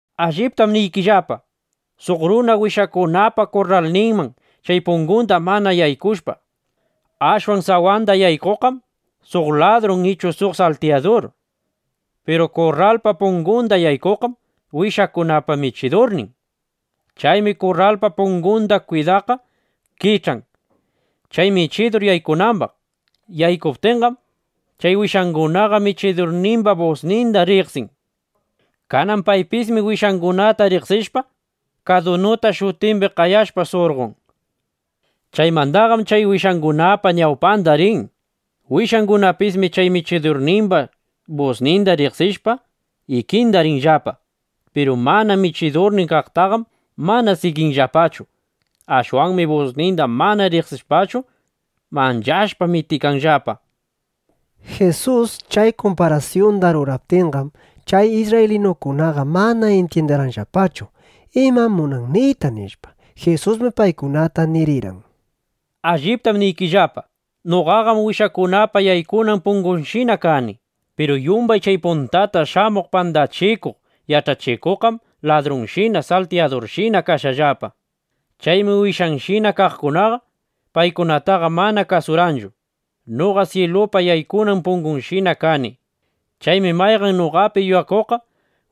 ’Alliptam niykillapa, suq runa wishakunapa kurralninman chay pungunda mana yaykushpa, ashwan sawanda yaykuqqam suq ladrun ichu suq saltiyadur. Piru kurralpa pungunda yaykuqqam wishakunapa michidurnin. Chaymi kurralpa pungunda kwidaqqa kich'an, chay michidur yaykunambaq. Yaykuptinqam, chay wishangunaqa michidurnimba busninda riqsin. Kanan paypismi wishangunata riqsishpa, kadunuta shutimbi qayashpa, surqon. Chaymandaqam chay wishangunapa ñawpanda rin. Wishangunapismi chay michidurnimba busninda riqsishpa, ikinda rinllapa. Piru mana michidurnin kaqtaqam mana siginllapachu. Ashwanmi busninda mana riqsishpachu, manchashpa mitikanllapa. Jisus chay kumparasyunda ruraptinqam, chay isrraylinukunaqa mana intyindirqanllapachu: imam munan niyta, nishpa. Jisusmi paykunata nirirqan: —Alliptam niykillapa, noqaqam wishakunapa yaykunan pungushina kani. Piru yumbay chay puntata shamuq pandachikuq yach'achikuqqam ladrunshina, saltiyadurshina kashqallapa. Chaymi wishayshina kaqkunaqa paykunataqa mana kasurqanchu. Noqam syilupa yaykuna pungunshina kani. Chaymi mayqan noqapi yuyakuqqa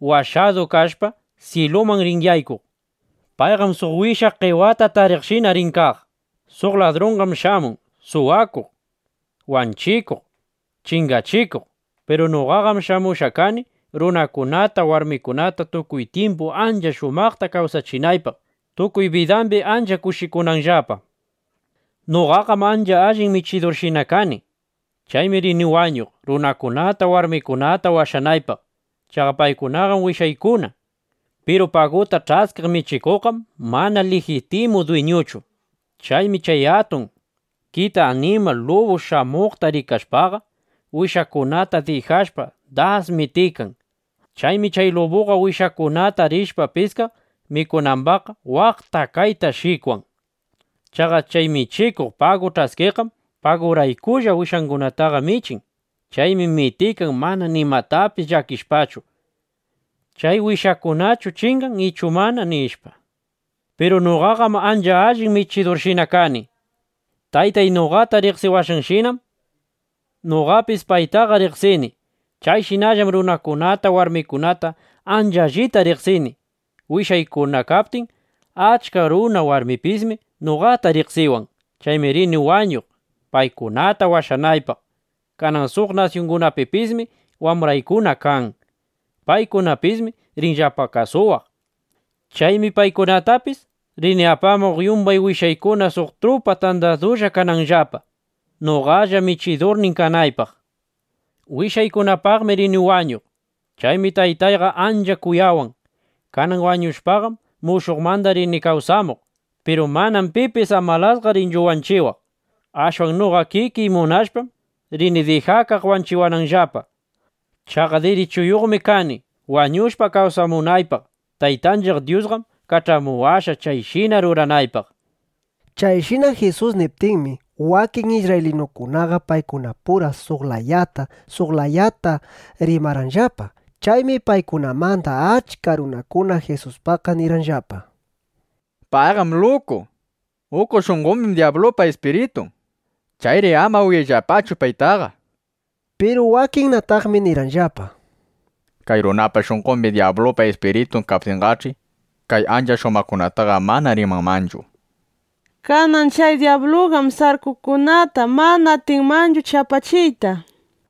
washadu kashpa, syiluman rin yaykuq. Payqam suq wisha qewata tariqshina rin kaq. ’Suq ladrunqam shamun suwakuq, wanchikuq, chingachikuq. Piru noqaqam shamushqa kani, runakunata, warmikunata tukuy tyimpu ancha shumaqta kawsachinaypaq, tukuy bidambi ancha kushikunanllapa. Noqaqam ancha allin michidurshina kani. Chaymi rini wañuq, runakunata, warmikunata washanaypaq. Chaqa paykunaqam wishaykuna. Piru paguta ch'askiq michikuqqam mana lijitimu dwiñuchu. Chaymi chay atun kita animal lubu shamuqta rikashpaqa, wishakunata dijashpa, das mitikan. Chaymi chay lubuqa wishakunata rishpa piskaq mikunambaqqa, waqta kayta shikwan. Chaqa chay michikuq pagu ch'askiqqam paguraykulla wishakunataqa michin. Chaymi mitikan, mana nimatapis llakishpachu, ¿chay wishakunachu chingan ichu mana? nishpa. ’Piru noqaqam ancha allin michidurshina kani. Taytay noqata riqsiwashqanshinam noqapis paytaqa riqsini. Chayshinallam runakunata, warmikunata ancha allita riqsini, wishaykuna kaptin. Achka runa, warmipismi noqata riqsiwan. Chaymi rini wañuq, paykunata washanaypaq. Kanan suq nasyungunapipismi wambraykuna kan. Paykunapismi rinllapa kasuwaq. Chaymi paykunatapis rini apamuq, yumbay wishaykuna suq trupa tandadulla kananllapa, noqalla michidurnin kanaypaq. ’Wishaykunapaqmi rini wañuq. Chaymi Taytayqa ancha kuyawan. Kanan wañushpaqam, mushuqmanda rini kawsamuq. Piru manam pipis amalasqa rinchu wanchiwaq. Ashwan noqa kikiy munashpam, rini dijakaq wanchiwananllapa. Chaqa dirichuyuqmi kani wañushpa, kawsamunaypaq. Taytanchiq Dyusqam kach'amuwashqa, chayshina ruranaypaq. Chayshina Jisus niptinmi, wakin isrraylinukunaqa paykunapura suq layata, suq layata rimarqanllapa. Chaymi paykunamanda achka runakuna Jisuspaqqa nirqanllapa: —Payqam luku. Uku shunqombim dyablupa ispiritun. Chayri ama uyayllapachu paytaqa, nishpa. Piru wakinnataqmi nirqanllapa: —Kay runapa shunqombi dyablupa ispiritun kaptinqach'i, kay ancha shumaqkunataqa mana rimanmanchu. Kanan chay dyabluqam sarkukunata mana atinmanchu chapachiyta, nishpa.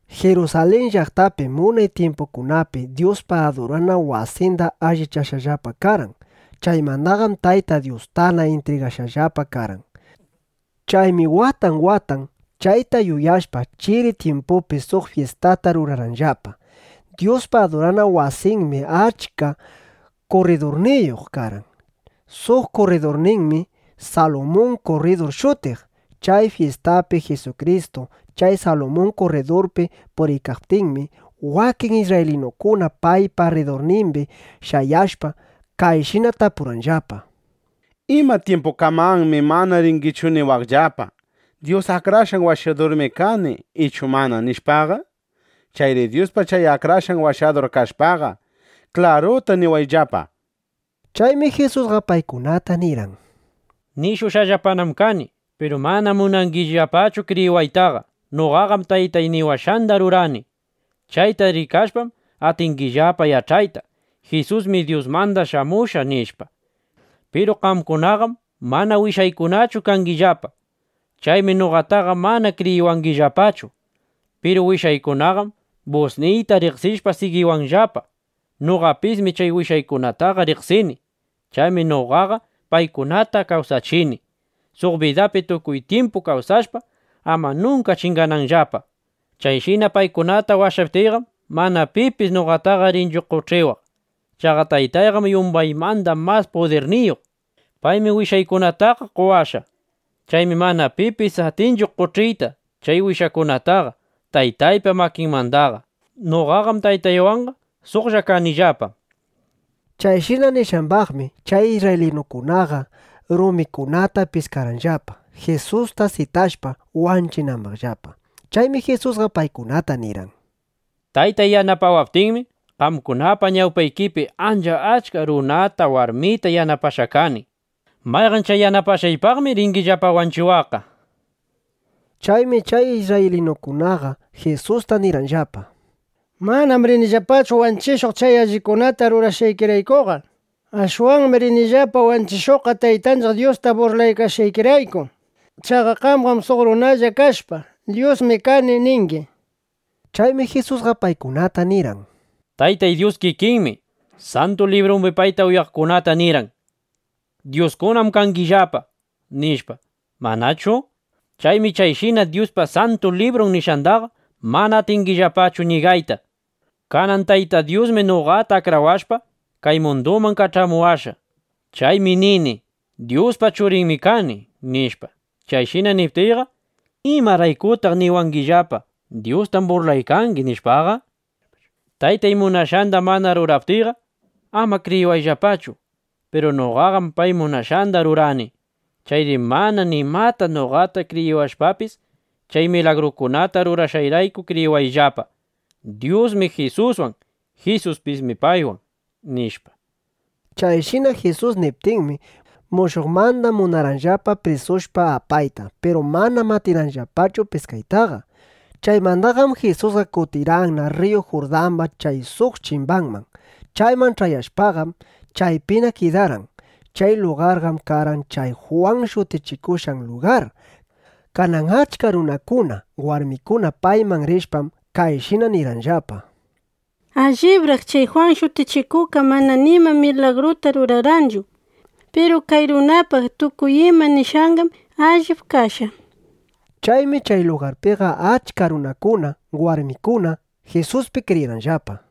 Jirusalin llaqtapim unay tyimpukunapi Dyuspa adurana wasinda allichashqallapa karqan. Chaymandaqam Tayta Dyustana intrigashqallapa karqan. Chaymi watan watan, chayta yuyashpa, chiri tyimpupi suq fyistata rurarqanllapa. Dyuspa adurana wasinmi achka kurridurniyuq karqan. Suq kurridurninmi Salumun kurridur shutiq. Chay fyistapi Jisukristu chay Salumun kurridurpi puriykaptinmi, wakin isrraylinukuna paypa rridurnimbi shayashpa, kayshina tapurqanllapa: —¿Ima tyimpukamanmi mana ringichu niwaqllapa: “Dyus Akrashqan Washadurmi kani” ichu mana, nishpaqa? Chayri Dyuspa chay Akrashqan Washadur kashpaqa, klaruta niwayllapa, nishpa. Chaymi Jisusqa paykunata nirqan: —Nishushqallapanam kani. Piru manam munangillapachu kriyiwaytaqa. Noqaqam Taytay niwashqanda rurani. Chayta rikashpam, atingillapa yach'ayta: Jisusmi Dyusmanda shamushqa, nishpa. Piru qamkunaqam mana wishaykunachu kangillapa. Chaymi noqataqa mana kriyiwangillapachu. Piru wishaykunaqam busniyta riqsishpa, sigiwanllapa. Noqapismi chay wishaykunataqa riqsini. Chaymi noqaqa paykunata kawsachini, suq bidapi tukuy tyimpu kawsashpa, ama nunka chingananllapa. Chayshina paykunata washaptiyqam, mana pipis noqataqa rinchu qoch'iwaq. Chaqa Taytayqam yumbaymanda mas pudirniyuq. Paymi wishaykunataqa qowashqa. Chaymi mana pipis atinchu qoch'iyta chay wishaykunataqa Taytaypa makinmandaqa. Noqaqam Taytaywanqa suqlla kanillapa, nishpa. Chayshina nishqambaqmi, chay isrraylinukunaqa rumikunata piskarqanllapa, Jisusta sitashpa, wanchinambaqllapa. Chaymi Jisusqa paykunata nirqan: —Taytay yanapawaptinmi, qamkunapa ñawpaykipi ancha achka runata, warmita yanapashqa kani. ¿Mayqan chay yanapashqaypaqmi ringillapa wanchiwaqqa? nishpa. Chaymi chay isrraylinukunaqa Jisusta nirqanllapa: —Manam rinillapachu wanchishuq chay allikunata rurashqaykiraykuqa. Ashwanmi rinillapa wanchishuqqa Taytanchiq Dyusta burlashqaykirayku. Chaqa qamqam suq runalla kashpa, “Dyusmi kani” ningi, nishpa. Chaymi Jisusqa paykunata nirqan: —Tayta Dyus kikinmi Santu Librumbi payta uyaqkunata nirqan: “Dyuskunam kangillapa”, nishpa, ¿manachu? Chaymi chayshina Dyuspa Santu Librun nishqandaqa mana atingillapachu ñigayta. Kanan Tayta Dyusmi noqata akrawashpa, kay munduman kach'amuwashqa. Chaymi nini: “Dyuspa Churinmi kani”, nishpa. Chayshina niptiyqa, ¿imaraykutaq niwangillapa: “Dyustam burlaykangi”, nishpaqa? Taytay munashqanda mana ruraptiyqa, ama kriyiwayllapachu. Piru noqaqam pay munashqanda rurani. Chayri mana nimata noqata kriyiwashpapis, chay milagrukunata rurashqayrayku kriyiwayllapa: Dyusmi Jisuswan; Jisuspismi paywan, nishpa. Chayshina Jisus niptinmi, mushuqmanda munarqanllapa prisushpa apayta. Piru manam atirqanllapachu piskaytaqa. Chaymandaqam Jisusqa kutirqanna rriyu Jurdamba chay suq chimbanman. Chayman ch'ayashpaqam, chaypina kidarqan. Chay lugarqam karqan chay Jwan shutichikushqan lugar. Kanan achka runakuna, warmikuna payman rishpam, kayshina nirqanllapa: —Allibraq chay Jwan Shutichikuqqa mana nima milagruta rurarqanchu. Piru kay runapaq tukuy ima nishqanqam allip kashqa, nishpa. Chaymi chay lugarpiqa achka runakuna, warmikuna Jisuspi kriyirqanllapa.